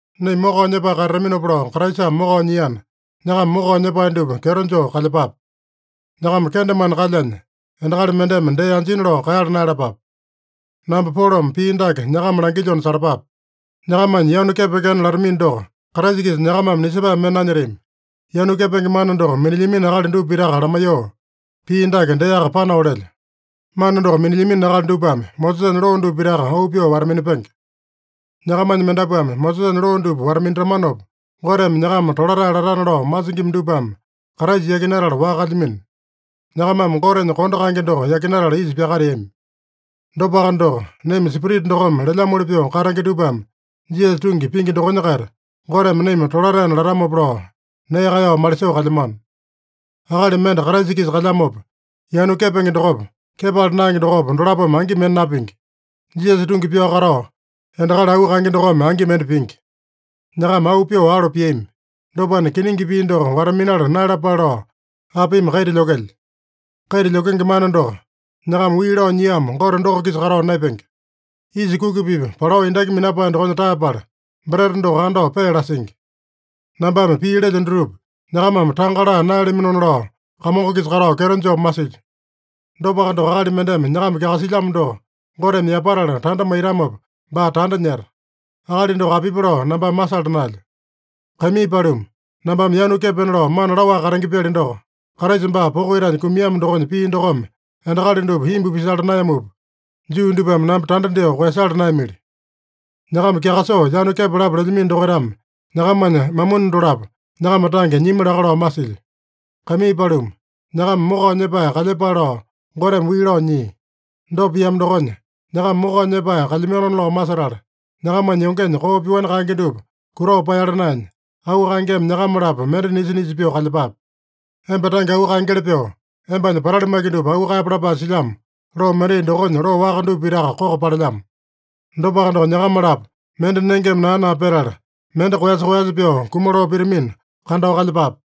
Naima mokao nyepae katataminopa lao Kraisame mokao nyiana, nyakama mokao nyepae dupa kyeto joo kalyepape. Nyakama kendemane kalyanya, endakali mendeme dee anjina lao kaeyala naeyalapape! Namba Polome pii dake nyakama langilyona salapape: Nyakamanya yanu kepekena latamino doko, Kraisa-kisa nyakamame nisepae mende nanyetami. Yanu kepenge mana doko minilyamino akali dupa pitaka lamaiyoo, pii dake deaka panao lelyo: Mana doko minilyamino akali dupame Mosesanya loo dupa pitaka auu pyoo wata-minapenge. Nyakamanya mendapuame Mosesanya loo dupa wata-minatamanopa Goteme nyakama tolatae latana lao masingima dupame Kraisa yakinatala waka kalyamino. Nyakamame Gotenya kondo kaenge doko yakinatala isa pyakateami. Dopaka doko, naima Spirita dokome lelyamoli pyoo katenge dupame, Jisasa tungi pingi dokonya-kaita Goteme naima tolataena latamopa lao nee kaeyao malisoo kalyamano. Akali mende Kraisa-kisa kalyamopa, yanu kepenge dokopa, kepala naenge dokopa, dolapome angi mende napingi. Jisasa tungi pyao katao, endakali auu kaenge dokome angi mende pingi. Nyakama auu pyoo alo piami. Dopana, kiningi pii doko wata-minala naeyalapale lao apimi kaita lyokelya? Kaita lyokenge mana doko, nyakama wii lao nyiamo Gote doko-kisa katao naepenge. Yisa kuki-pipa palao endaki minapae dokonya taeyapala, breta doko andao pee lasingi. Nambame pii lelyo dutupa nyakamame tanga laa naeyalaminona lao, Kamongo-kisa katao kyeto joo masilyo. Dopaka doko, akali mendeme nyakama kyakasilyamo doko Goteme yapatala tanda maitamopa, baa tanda nyeta. Akali doko apipi lao nambame masala naelyo. Kaimii paluma, nambame yanu kepena lao mana laowaka katenge-pyali doko, Kraisa baa poko itanya kumiamo dokonya pii dokome endakali dupa imbu pisala naeyamupa, Juu dupame namba tanda dyoo koeyasala naeyamili. Nyakama kyakasoo yanu kepalapa lelyamino dokaitame nyakamanya mamuni dolapo nyakama tange nyimi laka lao masilyo. Kaimii paluma, nyakama mokao nyepae kalyepale lao Goteme wii lao nyia. Dopa piamo dokonya, nyakama mokao nyepae kalyamanona lao masetala, nyakamanya yongenya koo pyoani kaenge dupa kutao paeyala naenya, auu kaengeme nyakama-lapo mende nisa-nisa pyoo kalyepape. “Emba tange auu kaengeli pyoo, embanya patali maki dupa auu kaeyape” lapae silyamo loo mendai dokonya loo waka dupa pitaka koko palelyamo. Dopaka doko, nyakama-lapo mende nengeme naa-naa petala, mende koeyasa-koeyasa pyoo kumaloo pitamina, kandao kalyepape.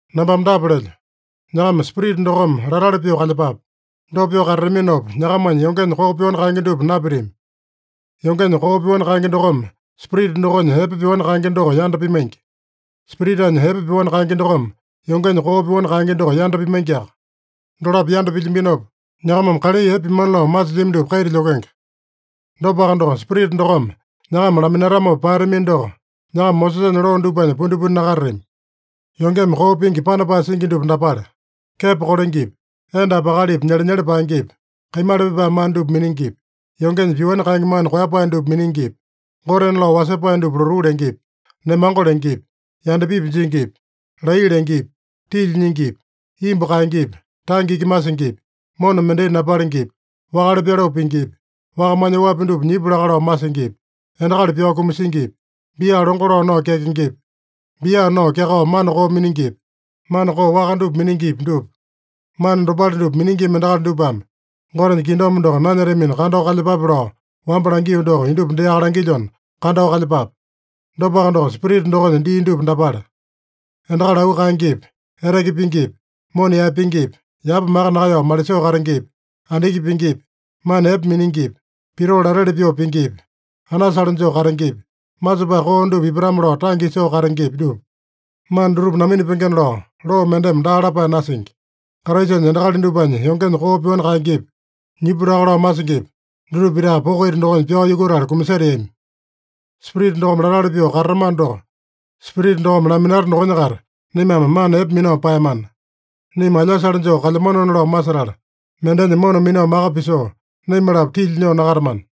Nambame dapa lelyo: Nyakama Spirita dokome latali pyoo kalyepape. Dopa pyoo katataminopa, nyakamanya yongenya koo pyoani kaenge dupa napitami. Yongenya koo pyoani kaenge dokome Spirita dokonya epe pyoani kaenge doko yanda pimaingi. Spiritanya epe pyoani kaenge dokome yongenya koo pyoani kaenge doko yanda pimaingiaka. Dolapo yanda pilyambinopa, nyakamame kalai epe pimana lao masilyami dupa kaita lyokenge. Dopaka doko, Spirita dokome nyakama laminatamopa paeyatamino doko, nyakama Mosesanya loo dupanya pundipundi nakatatami. Yongeme koo pingi panapae singi dupa dapale: kepo kolengepi, endapi akalipi nyelenyele paengepi, kaimala pipae mana dupa miningipi, yongenya pyoani kaenge mana koeyapae dupa miningipi, gotena lao wasepae dupa lotuu lengepi, nemango lengepi, yandapipi jingipi, laiya lengepi, tilya nyingipi, imbu kaengepi, tange iki masingipi, mona mendai napalengepi, wakale pyaloo pingipi, wakamanya oapi dupa nyipu laka lao masingipi, endakali pyao kumasingipi, bia longo lao nao kyakengepi, bia nao kyakao mana koo miningipi, mana koo waka dupa miningipi, dupa. Mana dopale dupa miningima endakali dupame Gotenya kingdom doko nanyetamina kandao kalyepape lao wamba langio doko, indupa deaka langilyona, kandao kalyepape. Dopaka doko, Spirita dokonya dii dupa dapale: endakali auu kaengepi, eteke pingipi, mona yaepengepi, yapa maka nakaeyao malisoo katengepi, andiki pingipi, mana epe miningipi, pitoo lateli pyoo pingipi, anasale joo katengepi, masepae koo dupa ipatame-lao tange isoo katengepi, dupa. Mana dutupa naminapengena lao, loo mendeme daa lapae nasingi. Kraisanya endakali dupanya yongenya koo pyoani kaengepi, nyipu laka lao masingipi, dutupa pitaka poko ita dokonya pyao yukutala kumaseteami. Spirita dokome latali pyoo katatamano doko, Spirita dokome laminata dokonya-kaita naimame mana epe minao paeyamana. Naima alyasale joo kalyamanona lao masetala, mendenya mona minao maka pisoo, naima-lapo tilya nyoo nakatamana.